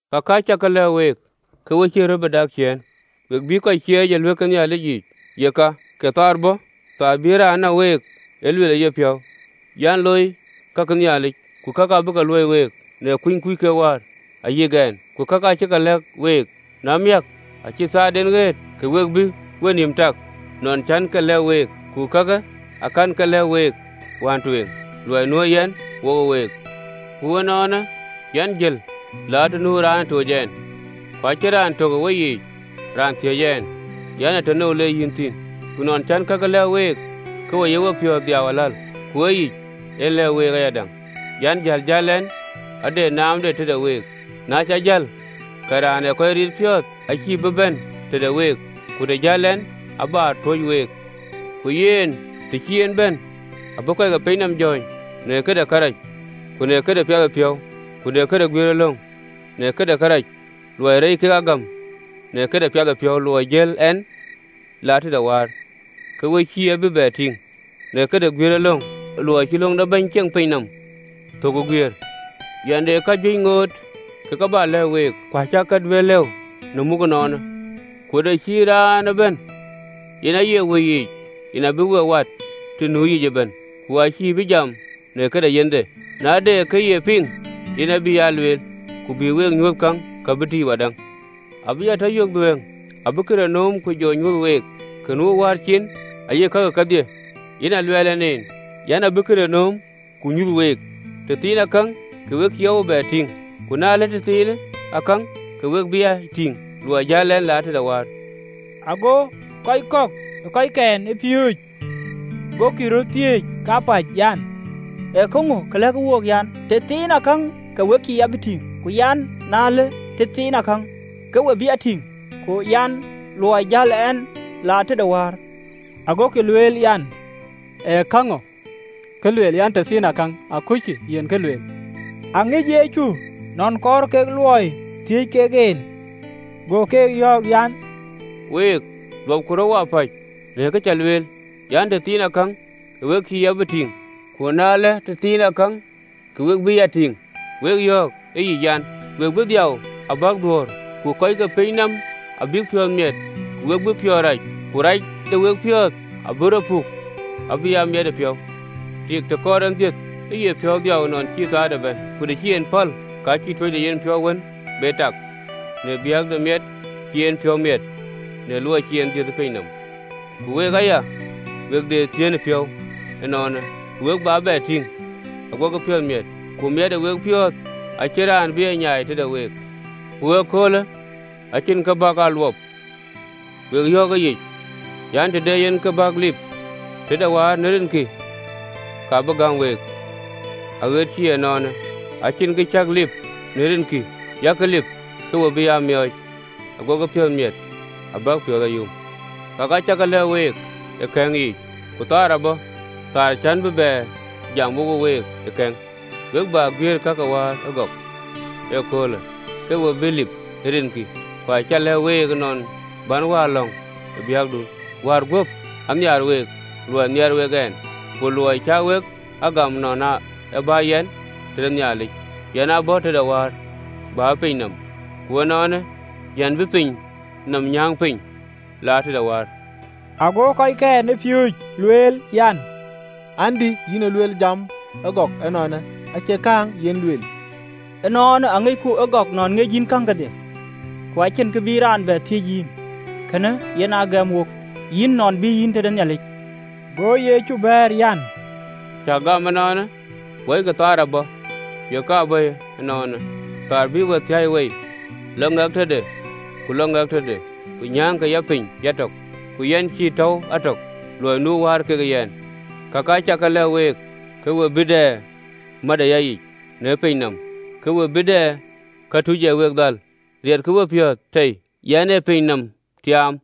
“Kakë acä ke lɛ̈k week, ke we cïï röt bï dak ciëën. We bïï kɔc cieec ë ɣööt ke Nhialic yiic, yeka kööl abɔ̈, kööl bï raan näk week e lueel ë yepiɔ̈u an, looi ka ke Nhialic. Ku kakë abïk ke luöi week, në kuny kuc kek Wäär, ayïk ɛn. Ku kakë acä ke lɛ̈k wek: na miäk, acï köölden ɣëët, ke we bï wenïïm tak nɔn cän ke lɛ̈k week. Luɔi de Wëidït Ku kakë akɛ̈n ke lɛ̈k week wään tueŋ, luɔi nuö yɛn wokë week. Ku ënɔɔnë, yɛn jël la të nu raan ë toc ɛn, ku acïn raan tök ë weyiic raan thiëc ɛn an, ee tënou le yïn thïn? Ku nɔn cän ee kakë lɛ̈k wek, ke we ye piɔ̈ɔ̈th guɔ dhiau aläl. Ku ee yic en lɛ̈k week ayadäŋ an, jäl jäl ɛn ade naamde tëde week: na cä jël, ke Raan ee kɔc riit piɔ̈ɔ̈th acïï bï bɛ̈n tëde week, ku të jäl ɛn, abä tuöc week. Ku yen, të cï en bɛ̈n, abï kɔc ke piny nɔm jɔ̈ɔ̈ny në këde kërac, ku në këde piathëpiɔ̈u, ku në këde guiëërëlöŋ: në këde kërac, luɔi reec kek a gam, në këde piathëpiɔ̈u, luɔi jäl ɛn la tëde Wäär, ke we cïï a bï bɛ tïŋ, në këde guiëërëlöŋ, luɔi cï löŋ de bɛ̈ny ceŋ pinyë nɔm thök ë guiëër. “Yɛn de kajuëc ŋoot ka bä lɛ̈k week, ku acäkï ke duëër lëu ë muk ënɔɔnë. Ku të cï Raanë bɛ̈n, yen aye Wëi yic, yen abï we wat të nu yic ëbɛ̈n: ku acïï bï jam në këde yenhde, na de kë ye piŋ, yen abï aa lueel: ku abï we nyuöth käŋ, ka bï tïc wadäŋ. Abï ya tɔ yök dhuëëŋ: abï këdï nööm, ku jɔ nyuöth week. Ka nu ë Wäär cin ayek kakï kedhie: yen aa luɛɛl ɛn en an, abï këdï nööm, ku jɔ nyuöth week. “Tëthiinakäŋ, ke we cïï ya bï tïŋ, ku na ëlë tëthiinakäŋ, ke we bï ya tïŋ, luɔi jäl ɛn la tëde Wäär.” Ago kɔc kɔ̈k ee kɔckɛn ë piööcë gokï röt thiëëc kapäc an, “Ee käŋö kë lëk wook? An, tëthiinakäŋ, ke we cïï ya bï tïŋ, ku an, Na ëlë tëthiinakäŋ, ke we bï ya tïŋ, ‘ku ee luɔi jäl ɛn la tëde Wäär?’ Agokï lueel an, ee käŋö kë lueel an, ‘Tëthiinakäŋ? Akucku yen kë lueel!’ Aŋic Yecu nɔn kɔɔr kek luɔi thiëëc kek en, go ke yɔ̈ɔ̈k an, “Week luɔpkï röt wapäc në kë cä lueel an, ‘Tëthiinakäŋ, ke we cïï ya bï tïŋ na ëlë tëthiinakäŋ, ke we bï ya tïŋ?’ Wek yɔ̈ɔ̈k ë yic an: We bï dhiau abäk dhuöör, ku kɔc ke pinynɔm abïk piɔ̈ɔ̈th miɛt: ku we bï piɔ̈ɔ̈th rac, ku rac de wepiɔ̈ɔ̈th abï rɔ puk abï aa miɛtëpiɔ̈u. Tik, të kɔɔr en dhiëth, ee piɔ̈u dhiau nɔn cï köölde bɛ̈n: ku të cï en däk, ka cïï tuöcdepiɔ̈u wën be tak, në biäk de miɛt cï en piɔ̈u miɛt luɔi cï raan dhiëëth ë piny nɔm. Ku week aya, we de dhiën ë wepiɔ̈ɔ̈th ënɔɔnë: ku we bä bɛ tïŋ, aguɔkï piɔ̈ɔ̈th miɛt, ku miɛt ë wepiɔ̈ɔ̈th acïn raan bï e nyaai tëde week. “Ku ëköölë acïn kë bä wek a luɔp. Wek yɔ̈ɔ̈k ë yic an, Të de yen kë bäk lip tëde Wäär në rinkï, ka bï gäm week. Aɣet cï ënɔɔnë acïn kë cäk lip në rinkï: yak lip, ke we bï aa miɔɔc, aguɔkï piɔ̈ɔ̈th miɛt abäk piɔ̈ɔ̈th a yum. Kakë acä ke lɛ̈k week ë kɛ̈ŋ yiic: ku kööl abɔ̈, kööl cän bï bɛ jam wokë week ë kɛ̈ŋ, we bä guiëër ka ke Wäär ë gɔk. Ëköölë, ke we bï lip ë rinkï: ku acä lɛ̈k week nɔn bän Wäär lɔ̈ŋ ë biäkdun. Wäär guöp anhiaar week, luɔi nhiaar wek ɛn, ku luɔi cä wek a gam nɔn ë bä yɛn tëde Nhialic. Yɛn ë bɔ̈ tëde Wäär, bä ë piny nɔm: ku ënɔɔnë, yɛn be piny nɔm nyääŋ piny, la tëde Wäär. Ago kɔckɛn ë piööcë lueel an, “Andï, yïn luel jam agɔk ënɔɔnë, acie kääŋ yen luel. Ënɔɔnë aŋicku ëgɔk nɔn ŋic yïn käŋ kedhie, ku acïn kë bï raan bɛ thiëc yïn: kënë yen a gɛm wok yïn nɔn ë bï yïn tëde Nhialic.” Go Yecu bɛ̈ɛ̈r an, “Cäk gam ënɔɔnë? Wɔikï, kööl abɔ̈, yeka bɔ̈yë ënɔɔnë, kööl bï we thiäi wei, lɔ ŋɛk tëde ku lɔ ŋɛk tëde, ku nyääŋkï ya piny yatök: ku yɛn cïï tɔ̈u a tök, luɔi nu Wäär kekë ɛn. Kakë acä ke lɛ̈k week, ke we bï dɛ mät ë yayic. Në piny nɔm ke we bï dɛ këtuc ee we dhal: riɛtkï wepiɔ̈ɔ̈th tei! Yɛn ë piny nɔm tiaam.”